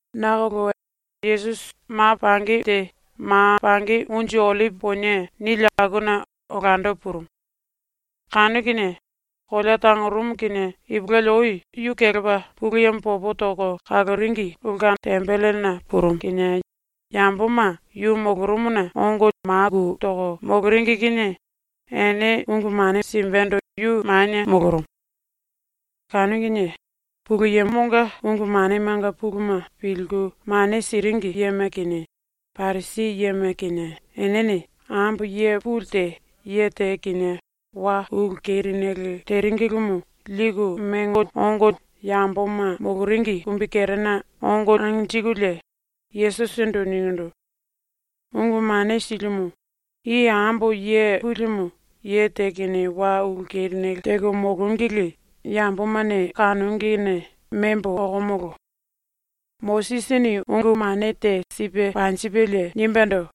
nakolo Yesusi ma pangi te ‘Ma Pangi Unju Ollipi Ponie’ nili akuna olando purumu. Kanu kinie kolea tangorumu kinie ipulueli ou yu kelepa ⸤Pulu Yemo popo toko kaloringi⸥ ulke tembelena purumu kinie yamboma yu molorumuna ongo maku toko moloringi kinie ene ungu mane simbendo yu manie molorumu. Kanu kinie Pulu Yemonga ungu manemanga puluma pilku mane siringi yema kinie Parisi yema kinie enene ambo ye puli te ye te kinie wa ulu kerinele teringilimu liku mengo ongo yamboma moloringi kumbikerena ongo anjikulie, Yesusindu ningindu: “Ungu Mane Silimu, i ambo ye pulimu ye te kinie wa ulu kerinele teko molongili yambomane kanongine membo okomolo. Mosisini ungu mane te sipe panjipelie nimbendo: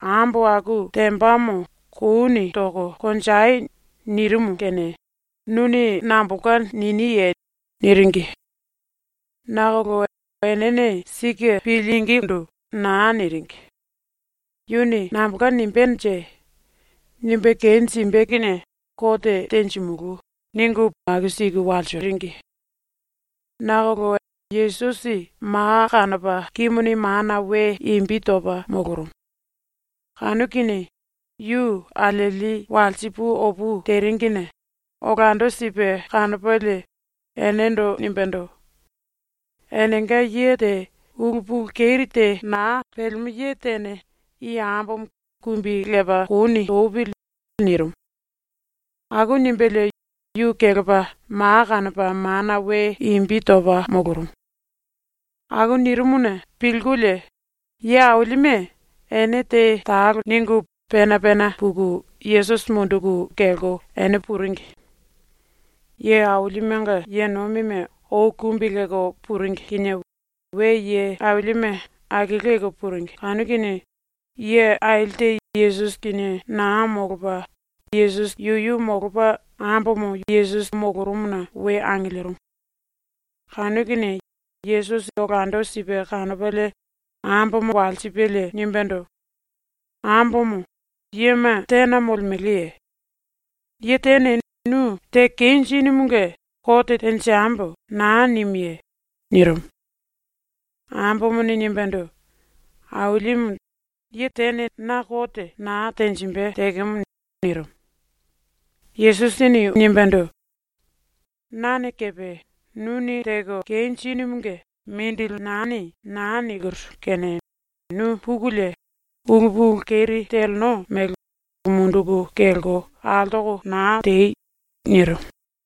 “Ambo aku tembamo kouni toko konjei.” nirimu kene nuni nambolka niniye?” niringi. Nakolo enene sike pilingindu naa niringi. ‘Yuni nambolka nimbenje? Nimbe kenjimbe kinie kote tenjimulú.’ ningu aku siku walsiringi. Nakolo Yesusi ma kanopa kimuni mana ⸤we⸥ imbi topa molorumu. Kanu kinie yu alieli walsi pu opu teringine olando sipe kanopalie enendo nimbendo: “Enenga ye te ulu pulu keri te naa pelemo ye tene i ambomo kumbi lepa kouni topili.” nirimu. Aku nimbelie yu kelepa ma kanopa mana we imbi topa molorumu. Aku nirimuna pilkulie ye ailime ene te talo ningu pena pena puku Yesusi munduku kelko ene puringi. Ye ailimenga ye nomime ou kumbi lelko puringi kinie we ye ailime akiliku puringi kanu kinie ye aili te Yesusi kinie naa molopa yuyu molopa, ambomo yu molorumuna we angilirimu. Kanu kinie Yesusi olando sipe kanopalie ambomo walsipelie nimbendo: “Ambomo, yema tena molemeleye? Ye tene nu ‘Teko kenjinumunge kote tenjembo.’ naa nimuye?” nirimu. Ambomone nimbendo: “Ailimu, tene na kote naa tenjimbe tekemo.” nirimu. Yesusini nimbendo: “Nane kepe ‘Nuni teko kenjinumunge mongo lieni.’ naa nikiru kene nu pukulie ulu pulu keri teleno mele munduku kelko altoko naa tei!” nirimu.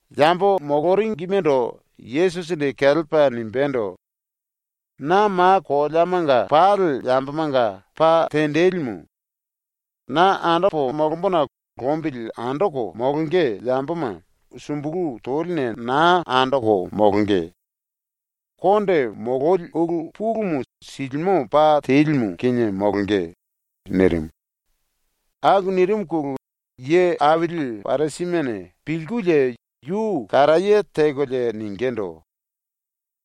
Yambo moloringimendo Yesusini kelepa nimbendo: “Na ma koleamanga pali yambomanga pa tenjilimu. Na andopo molombona lombili andoko molonge yamboma sumbulu toline naa andoko molonge. Konde mololi ulu pulumu silimo pa telimu kinie molonge.” nirimu. Aku nirimuna ye aili Parisimene pilkulie yu karaye tekolie ningindu: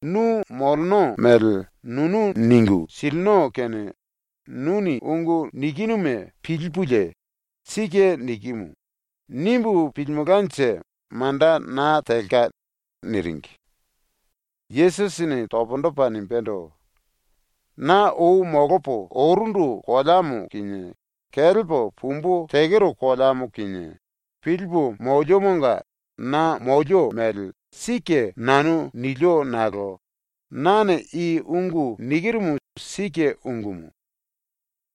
“Nu moleno mele nunu ningu silino kene nuni ungu nikinuma pilipulie ‘Sike nikimu.’ nimbu pilimelkanje manda naa telka.” niringi. Yesusini pundu topa nimbendo: “Na ou molopo orundu koleamo kinie kelepo pumbu tekero koleamo kinie pilipu moliomonga na molio mele sike nanu nilio nakolo nane i ungu nikirumu sike ungumu.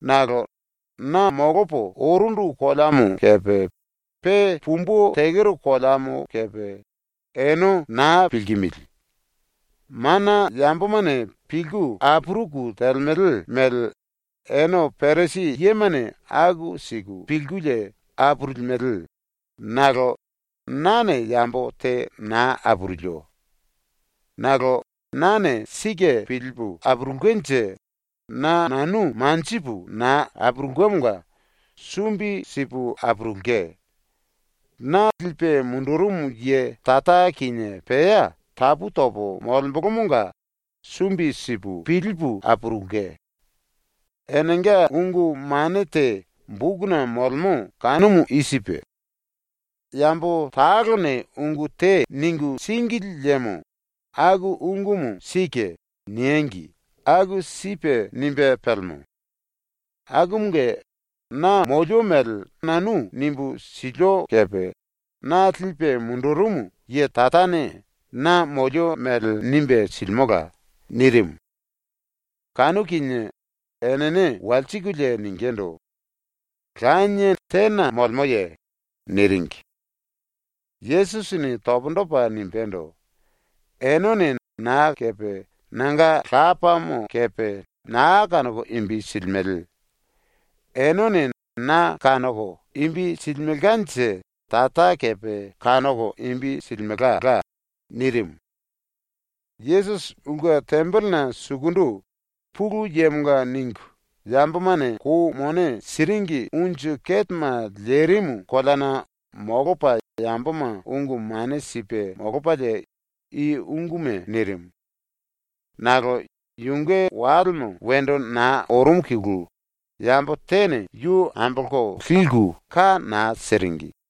Nakolo na molopo orundu koleamo kepe pe pumbu tekero koleamo kepe ene naa pilkimili. Mana yambomane pilku apuruku telemele mele ene Parisi yemane aku siku pilkulie apurulimele, nakolo nane yambo te naa apurulio. Nakolo nane sike pilipu apurulkenje na nanu manjipu naa apurulkemonga sumbi sipu apurulke. Na lipe mundurumu ye Tara kinie pea tapu topo molembolomonga sumbi sipu pilipu apurulke. Enenga ungu mane te bokuna molemo kanumu i sipe: ‘Yambo talone ungu te ningu síngili liemo ‘Aku ungumu sike.’ niengi.’ aku sipe nimbe pelemo. Akumunge na molio mele nanu nimbu silio kepe; na lipe mundurumu ye Tarane na molio mele nimbe silimola.” nirimu. Kanu kinie enene walsikulie ningindu: “Lanie tena molemoye?” niringi. Yesusini pundu topa nimbendo: “Enene na kepe nanga Lapamo kepe naa kanoko imbi silimele. Enene na kanoko imbi silimelkanje Tara kepe kanoko imbi silimelka.” nirimu. Yesusi ulke tembelena sukundu, Pulu Yemonga ningu yambomane kou mone siringi unju ketema lerimu koleana molopa yamboma ungu mane sipe molopalie i unguma nirimu. Nakolo yunge walemo wendo naa orumuna yambo tene yu ambolko liku ka naa siringi.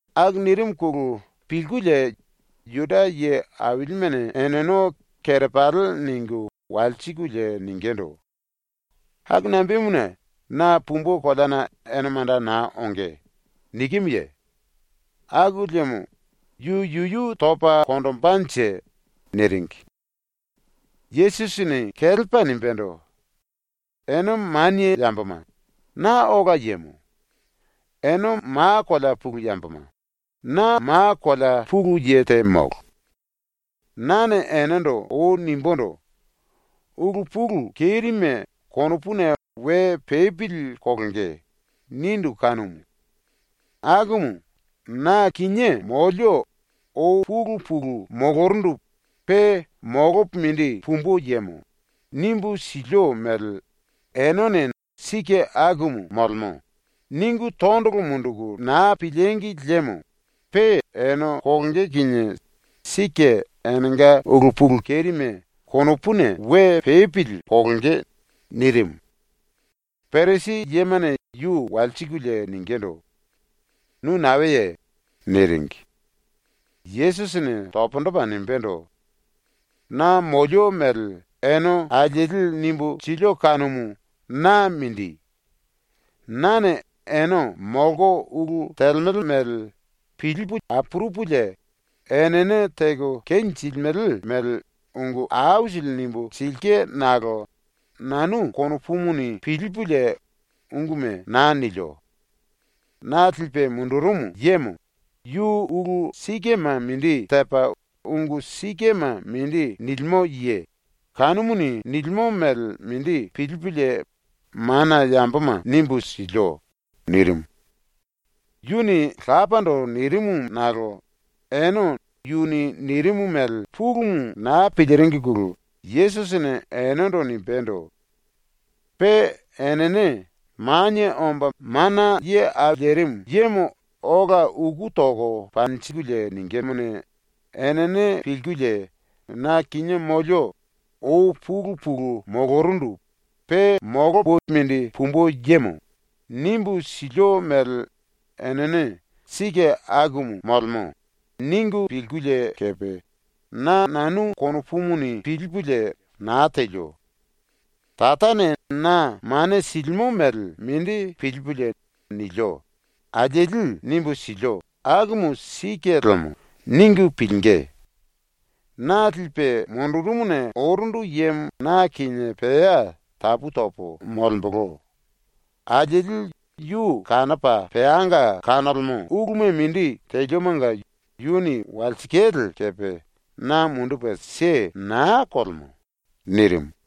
Aku nirimuna pilkulie Juda ye ailimene eneno kerepali ningu walsikulie ningindu: “Aku nambemuna ‘Na pumbu koleana ene manda naa onge.’ nikimuye? Aku liemo yu yuyu topa konjimbenje?” niringi. Yesusini kelepa nimbendo: “Ene manie yamboma, na ola yemo. Ene ma kolea pulu yamboma, na ma kolea pulu ye te molo. Nane enendo ou nimbundu: “Ulu pulu kerime konopuna we pepili kolonge.” nindu kanumu. Akumu “Na kinié molio ou pulu pulu molorundu pe molopo mindi pumbu yemo.” nimbu silio mele enene ‘Sike akumu molemo.’ ningu tondolo munduku naa pilíngi liemo pe ene kolonge kinie sike enenga ulu pulu kerime konopuna we pepili kolonge.” nirimu. Parisi yemane yu walsikulie ningindu: “Nu naeye?” niringi. Yesusini pundu topa nimbendo: “Na molio mele ene alieli nimbu silio kanumu na mindi. Nane ene molko ulu telemele mele pilipu apurupulie enene teko kenjilimele mele ungu aisili nimbu silke nakolo nanu konopuni pilipulie unguma naa nilio. Na lipe mundurumu yemo, yu ulu sikema mindi tepa ungu sikema mindi nilimo ye, kanumuni nilimo mele mindi pilipulie mana yamboma nimbu silio.” nirimu. Yuni Lapando nirimu nakolo ene yuni nirimu mele pulumu naa piliringine Yesusini enendo nimbendo: “Pe enene Manie Omba Mana Ye Au Lerimu Yemo ola uku toko panjingí kinie enene pilkulie “Na kinie molio ou pulu pulu molorundu pe molopo mindi pumbu yemo.” nimbu silio mele enene ‘Sike akumu molemo.’ ningu pilkulie kepe, “Na nanu konopuni pilipulie naa telio. Tarane na mane silimo mele mindi pilipulie nilio.” alieli nimbu silio ‘Akumu sike lemo.’ ningu pilingí. Na lipe mundurumuna orundu yemo na kinie pea tapu topo molembolo; alieli yu kanopa peanga kanolemo uluma mindi teliomonga yuni walsikale kepe na mundupe naa kelemo.” nirimu.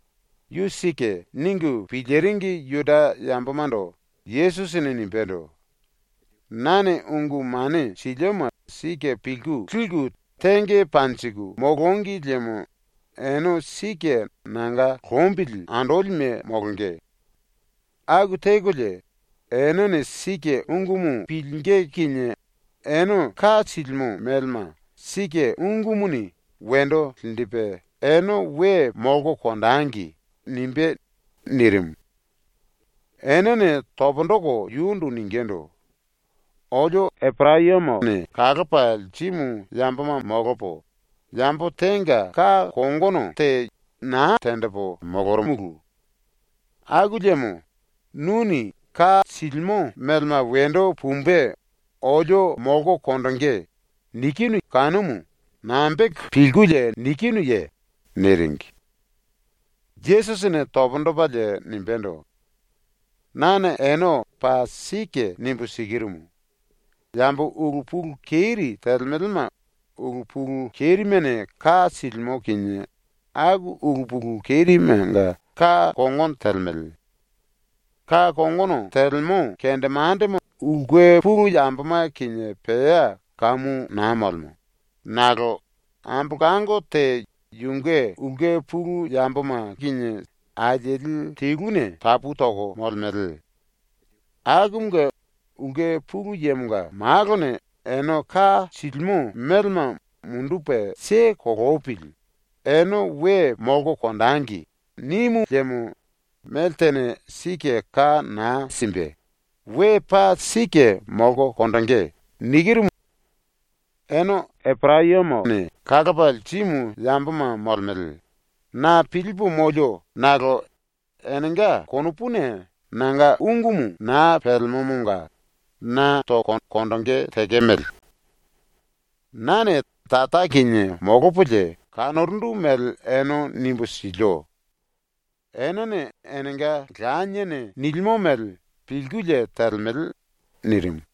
‘Yu sike.’ ningu piliringi Juda yambomando Yesusini nimbendo: “Nane ungu mane silioma sike pilku liku tenge panjiku molongi liemo ene sike nanga lombili andolime molonge. Aku tekolie, enene sike ungumu pilingí kinie ene ka silimo melema sike ungumuni wendo linjipe ‘ene we molko konjengi.’ nimbé.” nirimu. Enene pundu toko yundu ningindu: “Olio Eporayamone kalopa lirimu yamboma molopo, yambo tenga ka kongono te naa tenjipu molorumulu. Aku liemo nuni ‘Ka silimo melema wendo pumbe olio molko konjingí.’ ninu kanumu nambe teko pilkulie ninuye?” niringi. Yesusini pundu topalie nimbendo: “Nane ene paa sike nimbu sikirumu: Yambo ulu pulu keri telemelema ulu pulu kerimene ka silimo kinie aku ulu pulu kerimenga ka kongono telemele. Ka kongono telemo kendemandemo ulke pulu yamboma kinie pea kamu naa molemo, nakolo ambolango te yunge ulke pulu yamboma kinie alieli teluna tapu toko molemele. Akumunge ⸤Ulke Pulu Yemonga⸥ Malone ‘Ene ka silimo melema mundupe kelepili, ene we molko konjengi.’ nimu liemo meltene sike ka naa simbe, we paa sike molko konjingí. ‘Ene Eporayamone kalopa lirimu yamboma molemele.’ na pilipu molio nakolo enenga konopuna nanga ungumu naa pelemomonga na toko konjingí tekemele. Nane Tara kinie molopolie kanorundu mele ene nimbu silio. Enene enenga laniene nilimo mele pilkulie telemele.” nirimu.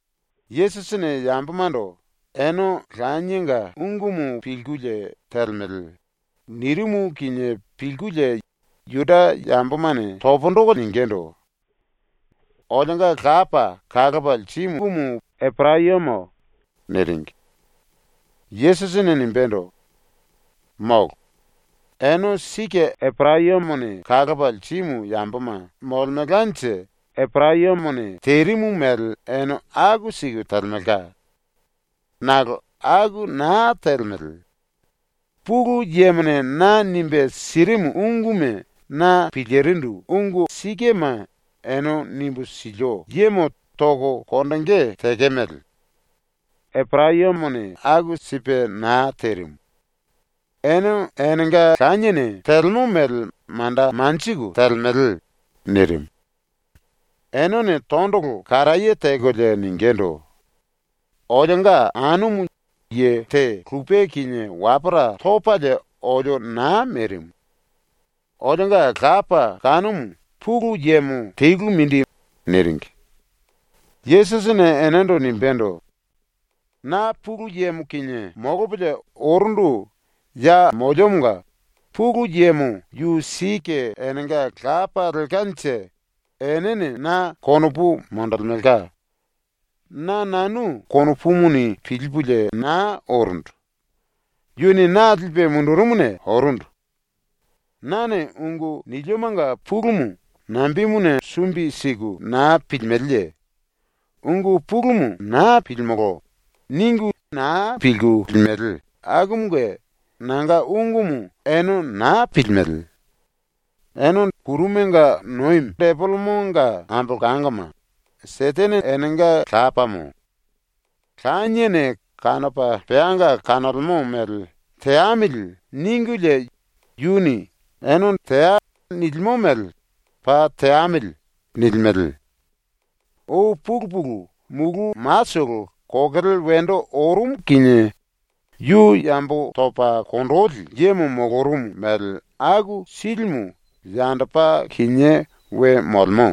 Yesusini yambomando “Ene lanienga ungumu pilkulie telemele.” nirimu kinie pilkulie Juda yambomane pundu toko ningindu: “Olionga lapa kalopa lirimumu Eporayamo.” niringi. Yesusini nimbendo: “Molo. Ene sike Eporayamone kalopa lirimu yamboma molemelkanje Eporayamone terimu mele ene aku siku telemelka. Nakolo aku naa telemele. Pulu Yemone na nimbe sirimu unguma na pilirindu ungu sikema ene nimbu silio yemo toko konjingí tekemele. Eporayamone aku sipe naa terimu. Ene enenga laniene telemo mele manda lelko telemele.” nirimu. Enene tondolo karaye tekolie ningindu: “Olionga anumu ye te lupe kinie wapora topalie olio naa merimu. Olionga lapa kanumu Pulu Yemo telu mindi.” niringi. Yesusini enendo nimbendo: “Na Pulu Yemo kinie molopolie orundu ya moliomonga Pulu Yemo yu sike enenga Lapa lelkanje enene na konopu monjilimelka. Na nanu konopuni pilipulie naa orundu. Yuni na lipe mundurumuna orundu. Nane ungu niliomanga pulumu nambemuna sumbi siku naa pilimeleye? ‘Ungu pulumu naa pilimolo.’ ningu liku su silimele akumunge nanga ungumu ene naa pilimele. Ene Depelemonga ambolangoma, Setene enenga lapamo. Laniene kanopa peanga kanolemo mele ‘teamili.’ ningulie yuni “Ene teai.” nilimo mele ‘Paa teamili.’ nilimele. Ou pulu pulu mulu matolo kokele wendo orumu kinie yu yambo topa konjili yemo molorumu mele aku silimu yandopa kinié we molemo.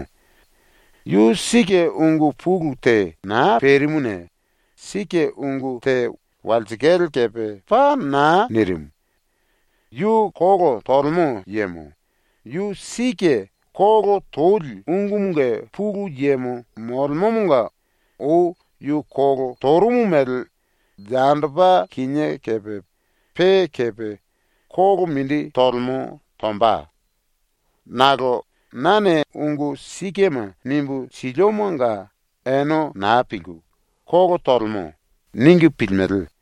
Yu sike ungu pulu te naa perimuna sike ungu te walsikale kepe paa naa nirimu. Yu kolo tolemo yemo; yu sike kolo toli ungumunge pulu yemo molemomonga ou yu kolo torumu mele yandopa kinié kepe pe kepe kolo mindi tolemo tomba. Nakolo nane ungu sikema nimbu siliomonga ene naa pilku ‘Kolo tolemo.’ ningu pilimele.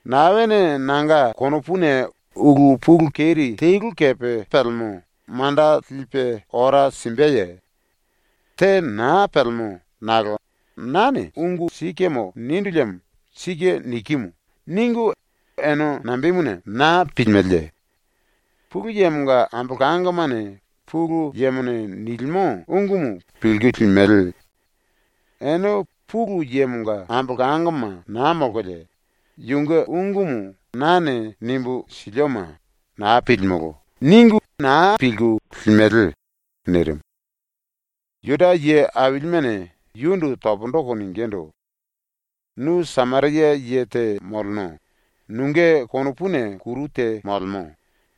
“Naene nanga konopuna ulu pulu keri telu kepe pelemo manda lipe ora simbeye? Te naa pelemo nakolo nane ungu sikemo nindu liemo ‘Sike nikimu.’ ningu ene nambemuna naa pilimeleye? Pulu Yemonga ambolangomane Pulu Yemone nilimo ungumu pilku limele. Ene Pulu Yemonga ambolangoma naa molkolie yunge ungumu nane nimbu silioma “Naa pilimulú.” ningu naa pilku limele.” nirimu. Juda ye ailimene yundu pundu toko ningindu: “ “Nu Sameria ye te moleno, nunge konopuna kuru te molemo.”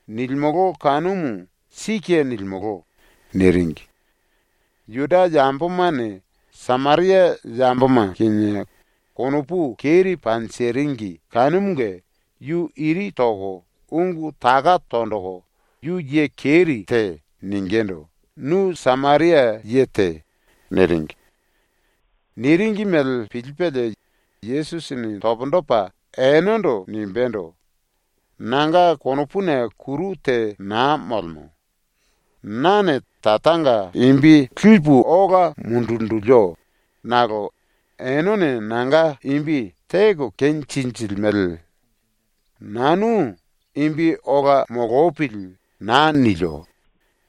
nilimolo kanumu sike nilimolo.” niringi. ⸤Juda yambomane Sameria yamboma kinie konopu keri panjiringi kanumunge yu iri toko ungu taka tonjiku “Yu ye keri te.” ningindu “Nu Sameria ye te.” niringi.⸥ Niringi mele pilipelie Yesusini pundu topa enendo nimbendo: “Nanga konopuna kuru te naa molemo. Nane Taranga imbi ola linjilio, nakolo enene nanga imbi teko kenjinjilimele. Nanu ‘Imbi ola molopili.’ naa nilio,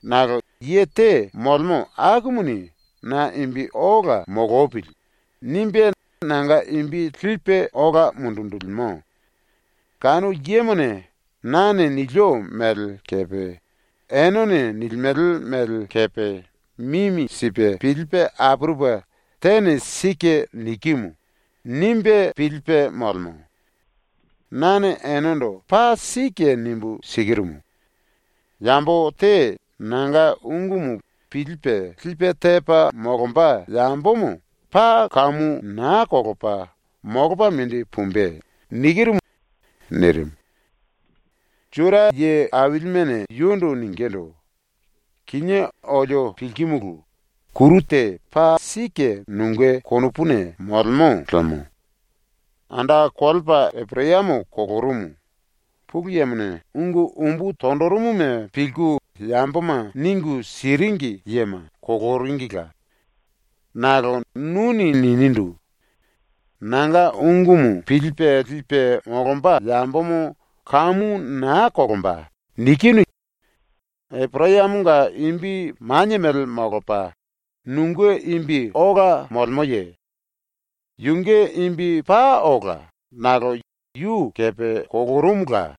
nakolo ye te molemo akumuni ‘Na imbi ola molopili.’ nimbe nanga imbi ambolopa ola linjilimo. Kanu yemone nane nilio mele kepe enene nilimele mele kepe mimi sipe pilipe apurupe tene ‘Sike nikimu.’ nimbe pilipe molemo. Nane enendo paa sike nimbu sikirumu: Yambo te nanga ungumu pilipe lipe tepa molomba yambomo paa kamu naa kolopa molopa mindi pumbe.” nirimu. Juda ye ailimene yundu ningindu: “Kinié olio pilkimulu, kuru te paa sike nunge konopuna molemo lemo. Anda kolepa Eporayamo kolorumu; Pulu Yemone ungu umbu tonjirimuma pilku yamboma ningu siringi yema koloringila. Nakolo nuni ninindu: “Nanga ungumu pilipe lipe molomba yambomo kamu naa kolomba.” nikinu. Eporayamonga imbi manie mele molopa nunge imbi ola molemoye? Yunge imbi paa ola, nakolo yu kepe kolorumula.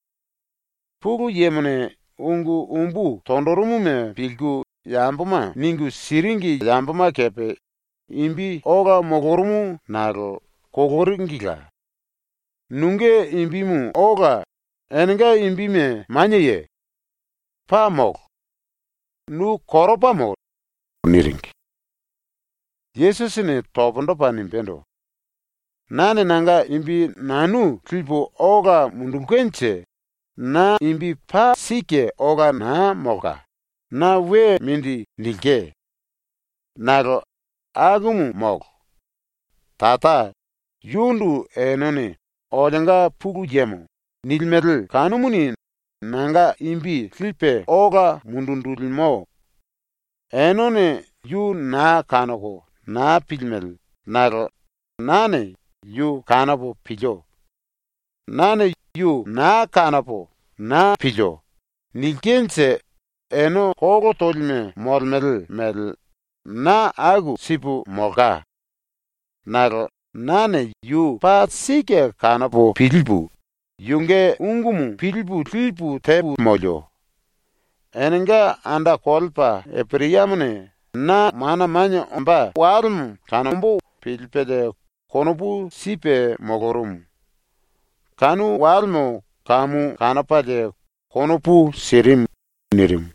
Pulu Yemone ungu umbu tonjirimuma pilku yamboma ningu siringi yamboma kepe imbi ola molorumu nakolo koloringila. Nunge imbimu ola enenga imbime manieye? Paa molo! Nu koropamo.” niringi. Yesusini pundu topa nimbendo: “Nane nanga imbi nanu ambolopo ola lilkenje na imbi paa sike ola naa molka, na we mindi nilke. Nakolo akumu molo. Tara, yundu enene “Olionga Pulu Yemo.” nilimele kanumuni nanga imbi ambolopa ola linjilimo. Enene yu naa kanoko naa pilimele nakolo nane yu kanopo pilio. Nane “Yu naa kanopo naa pilio.” nilkenje ene kolo tolime molemele mele na aku sipu molka. Nakolo nane yu paa sike kanopo pilipu, yunge ungumu pilipu lipu tepo molio. Enenga anda kolepa Eporayamone na mana manie ombó walemo kanomba pilipelie konopu sipe molorumu. Kanu walemo kamu kanopalie konopu sirimu.” nirimu.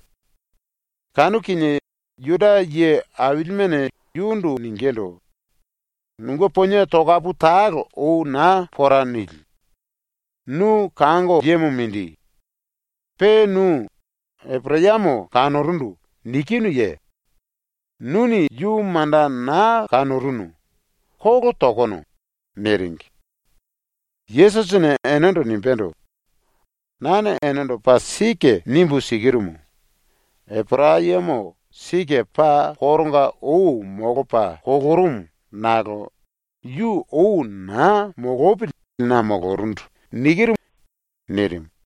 Kanu kinie Juda ye ailimene yundu ningindu: “Nunge ponie tokapu talo ou naa pora nili. Nu kango yemo mindi. Pe nu “Eporayamo kanorundu.” nikinuye? Nuni yu manda naa kanorunu. Kolo tokono.” niringi. Yesusini enendo nimbendo: “Nane enendo paa sike nimbu sikirumu: Eporayamo sike paa koronga ou molopa kolorumu nakolo yu ou naa molopili na molorundu.” nirimu.